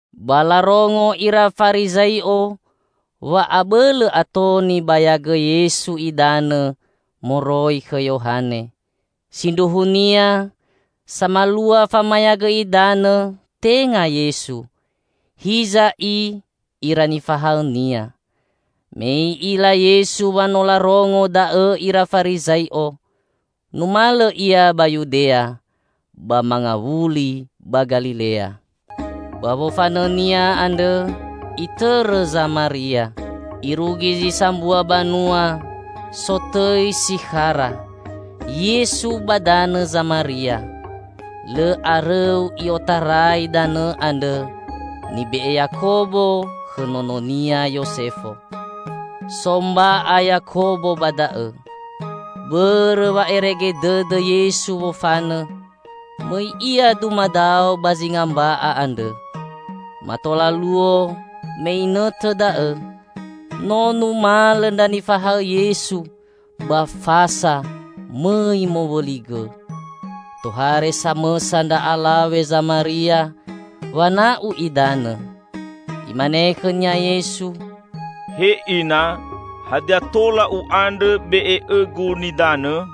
Ba larongo ira Farizai'o wa abõlõ ato nibayagõ Yesu idanõ moroi khõ Yohane. (Sindruhunia samalua famayagõ idanõ tenga Yesu, hiza i ira nifahaõ-Nia.) Me I'ila Yesu wa no larongo da'õ ira Farizai'o, numalõ Ia ba Yudea, ba mangawuli ba Galilea. Ba wofanõ-Nia andrõ Itõrõ Zamaria. Irugi zi sambua banua sotõi Sikhara Yesu ba danõ Zamaria, lõ arõu i'otarai danõ andrõ nibe'e Yakobo khõ nononia Yosefo. So mba'a Yakobo ba da'õ. Bõrõ wa'erege dõdõ Yesu wofanõ, mõi Ia dumadao ba zinga mba'a andrõ. Mato laluo me inõtõ da'õ, no numalõ ndra nifahaõ Yesu ba fasa mõi mowõli gõ. Tohare samõsa ndra alawe Zamaria wana'u idanõ. Imane khõnia Yesu, "He Ina, hadia tola U'andrõ be'e õ-Gu nidanõ?"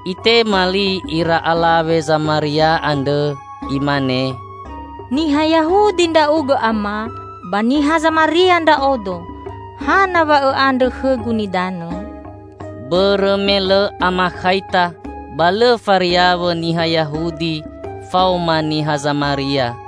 Itema li ira alawe Zamaria andrõ, imane, "Niha Yahudi Ndra'ugõ Ama; ba niha Zamaria ndra'odo; hana wa Õ'andrõ khõgu nidanõ?" (Bõrõ me lõ amakhaita ba lõ fariawõ niha Yahudi faoma niha Zamaria.)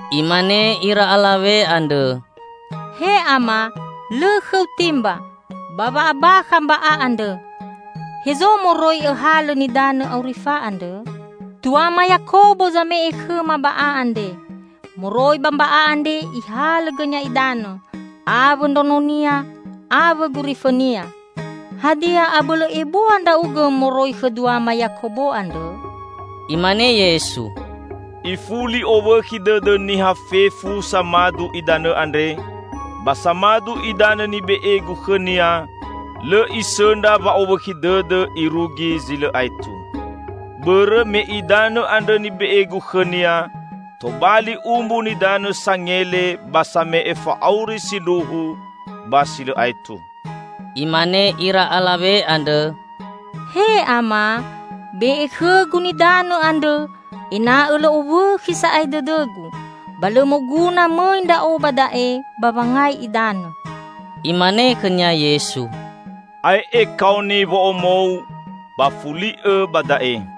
Imane ira alawe andrõ, "He Ama, lõ khõ-U timba, ba wa'abakha mba'a andre. Hezo moroi Õhalõ nidanõ aurifa andrõ? Tuama Yakobo zame'e khõma ba'a andre. Moroi ba mba'a andre ihalõ gõnia idanõ; awõ ndraononia awõ gurifõnia. Hadia, abõlõ ebua ndra'ugõ moroi khõ duama Yakobo andrõ?" Imane Yesu, "Ifuli owõkhi dõdõ niha fefu samadu idanõ andre, ba samadu idanõ nibe'e-Gu khõnia lõ isõndra wa'owõkhi dõdõ irugi zi lõ aetu. Bõrõ me idanõ andrõ nibe'e-Gu khõnia tobali umbu nidanõ sangele ba same'e fa'auri sindruhu ba si lõ aetu!" Imane ira alawe andrõ, "He Ama, be'e khõgu nidanõ andrõ ena'õ lõ owõkhi sa'ae dõdõgu; ba lõ moguna mõi ndra'o ba da'e ba wangai idanõ." Imane khõnia Yesu, "Ae'e kaoni wo'omou, ba fuli'õ ba da'e."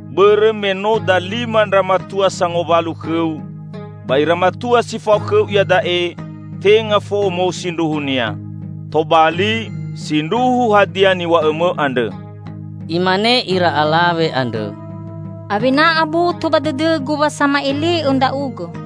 bõrõ me no dalima ndra matua sangowalu khõu, ba ira matua si fao khõu iada'e tenga fo'omou sindruhunia. Tobali, sindruhu hadia niw̃a'õmõ andrõ." Imane ira alawe andrõ, "Awena aboto ba dõdõgu wa sama'ele'õ ndra'ugõ.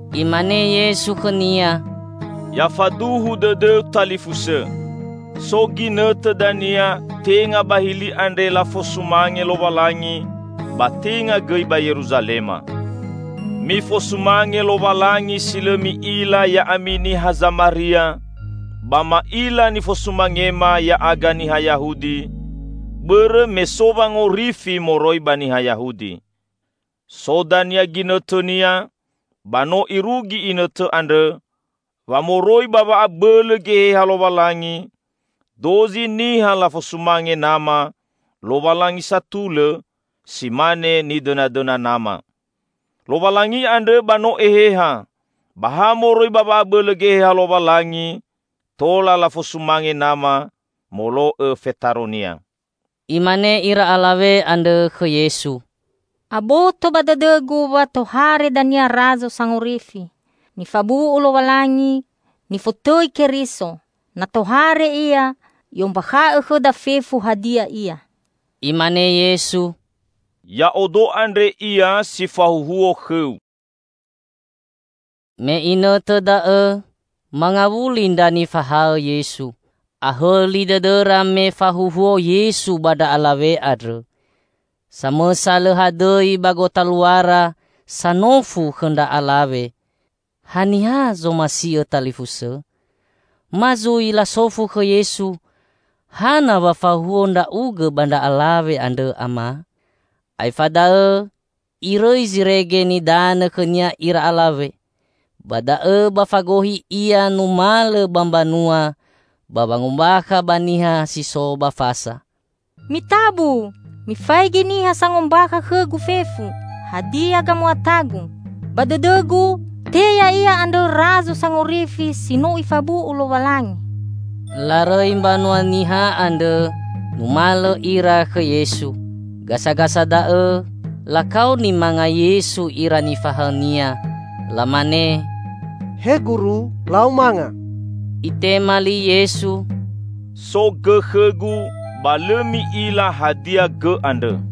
Imane Yesu khõnia, "Ya faduhu dõdõu talifusõ, so ginõtõ dania tenga ba hili andre lafosumange Lowalangi ba tenga gõi ba Yeruzalema. Mifosumange Lowalangi si lõ mi'ila ya'ami niha Zamaria, ba ma'ila nifosumangema ya'aga niha Yahudi, bõrõ me so wangorifi moroi ba niha Yahudi. So dania ginõtõnia, ba no irugi inõtõ andrõ, wa moroi ba wa'abõlõ Geheha Lowalangi, dozi niha lafosumange Nama, Lowalangi satulõ, si mane nidõnadõna Nama. Lowalangi andrõ ba no Eheha, ba ha moroi ba wa'abõlõ Geheha Lowalangi tola lafosumange Nama molo'õ fetaro-Nia." Imane ira alawe andrõ khõ Yesu, "Aboto ba dõdõgu wa tohare dania Razo Sangorifi (nifabu'u Lowalangi, nifotõi Keriso). Na tohare Ia, I'ombakha'õ khõda fefu hadia ia." Imane Yesu, "Ya'odo andre Ia si fahuhuo khõu." Me inõtõ da'õ mangawuli ndra nifahaõ Yesu. Ahõli dõdõra me fahuhuo Yesu ba ndra alawe andrõ. Samõsa lõ hadõi ba gotaluara sanofu khõ ndra alawe, "Hadia zomasi'õ talifusõ?" ma zui lasofu khõ Yesu, "Hana wa fahuhuo Ndra'ugõ ba ndra alawe andre, Ama?" Aefa da'õ irõi zirege nidanõ khõnia ira alawe ba da'õ ba fagohi ia numalõ ba mbanua ba wangombakha ba niha si so ba fasa, "Mitabu, mifaigi niha sangombakha khõgu fefu hadia gamuatagu. Ba dõdõgu, te Ya'ia andrõ Razo Sangorifi si no Ifabu'u Lowalangi!" Larõi mbanua niha andrõ numalõ ira khõ Yesu. Gasagasa da'õ lakaoni manga Yesu ira nifahaõ-Nia. Lamane, "He Guru, lau manga!" Itema li Yesu, "So gõ khõ-Gu ba lõ mi'ila hadia gõ andrõ."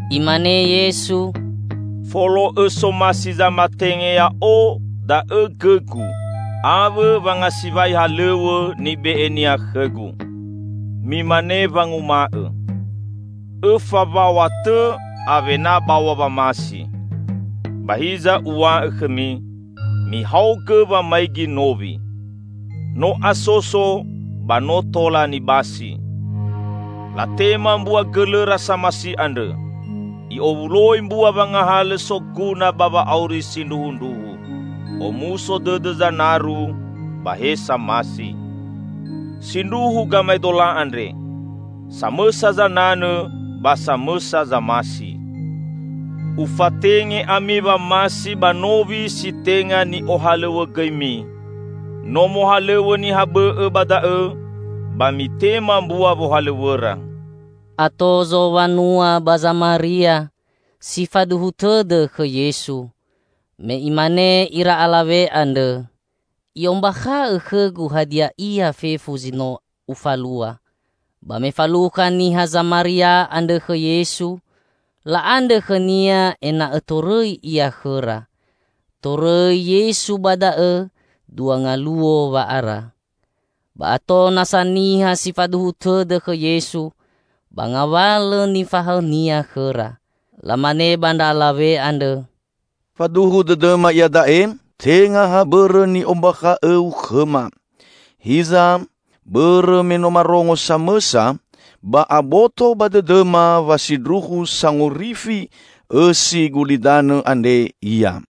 Imane Yesu, "Folo'õ somasi zamatenge Ya'o da'õ gõ-Gu, awõ wangasiwai halõw̃õ nibe'e-Nia khõ-Gu. Mimane wanguma'õ, 'õfa waw̃a tõ, awena baw̃a wamasi.' Ba hiza Uw̃a'õ khõmi: Mihaogõ wamaigi nowi. No asoso ba no tola nibasi! Latema mbua gõlõra samasi andrõ; i'owuloi mbua wangahalõ soguna ba wa'auri sindruhundruhu. Omuso dõdõ zanaru ba he samasi. Sindruhu gamaedola andre, 'Samõsa zananõ ba samõsa zamasi.' Ufatenge ami wamasi ba nowi si tenga ni'ohalõw̃õgõimi; no mohalõw̃õ niha bõ'õ ba da'õ, ba mitema mbua wohalõw̃õra." Ato zowanua ba Zamaria si faduhu tõdõ khõ Yesu, me imane ira alawe andrõ, "I'ombakha'õ khõgu hadia ia fefu zi no ufalua." Ba me falukha niha Zamaria andrõ khõ Yesu la'andrõ khõ-Nia ena'õ torõi Ia khõra. Torõi Yesu ba da'õ dua ngaluo wa'ara. Ba ato nasa niha si faduhu tõdõ khõ Yesu ba ngawalõ nifahaõ-Nia khõra. Lamane ba ndra alawe andrõ, "Faduhu dõdõma iada'e tenga ha bõrõ ni'ombakha'õu khõma, hiza bõrõ me no marongo samõsa, ba aboto ba dõdõma wa sindruhu sangorifi õsi gulidanõ andre Ia."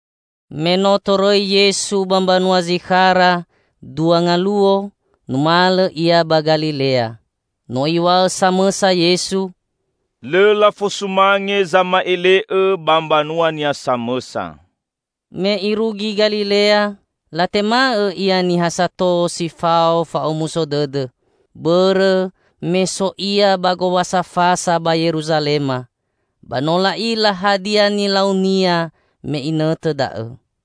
Me no torõi Yesu ba mbanua Zikhara dua ngaluo, numalõ Ia ba Galilea. No Iw̃a'õ samõsa Yesu, "Lõ lafosumange zama'ele'õ ba mbanuania samõsa." Me Irugi Galilea, latema'õ Ia niha sato si fao fa'omuso dõdõ. Bõrõ, me so Ia ba Gowasa Fasa ba Yeruzalema, ba no la'ila hadia nilau-Nia me inõtõ da'õ.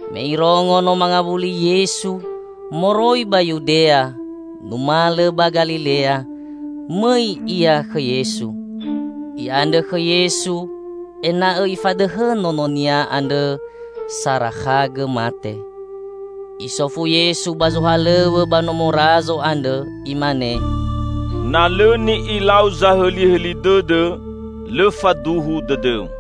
Me irongo no mangawuli Yesu moroi ba Yudea numalõ ba Galilea, mõi ia khõ Yesu. I'andrõ khõ Yesu ena'õ Ifadõhõ nononia andrõ sarakhagõ mate. Isofu Yesu ba zohalõw̃õ ba nomo Razo andrõ, Imane, "Na lõ ni'ilau zahõlihõli dõdõ, lõ faduhu dõdõu."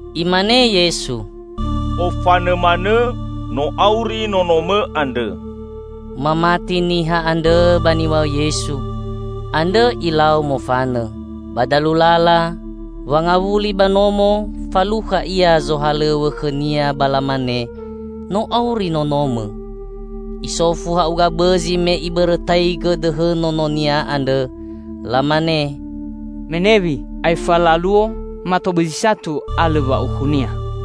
Imane Yesu, "Ofanõ manõ, no auri nonomõ andrõ." Mamati niha andrõ ba niw̃a'õ Yesu, andrõ ilau mofanõ. Ba dalu lala wangawuli ba nomo, falukha ia zohalõw̃õ khõnia ba lamane, "No auri nonomõ!" Isofu ha'uga bõzi me ibõrõtaigõ dõhõ nononia andrõ. Lamane, "Menewi, aefa laluo (mato bõzi satu) alõ wa'aukhunia."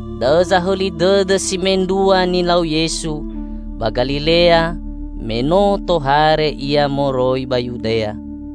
Da'õ zahõli dõdõ si mendrua nilau Yesu ba Galilea me no tohare Ia moroi ba Yudea.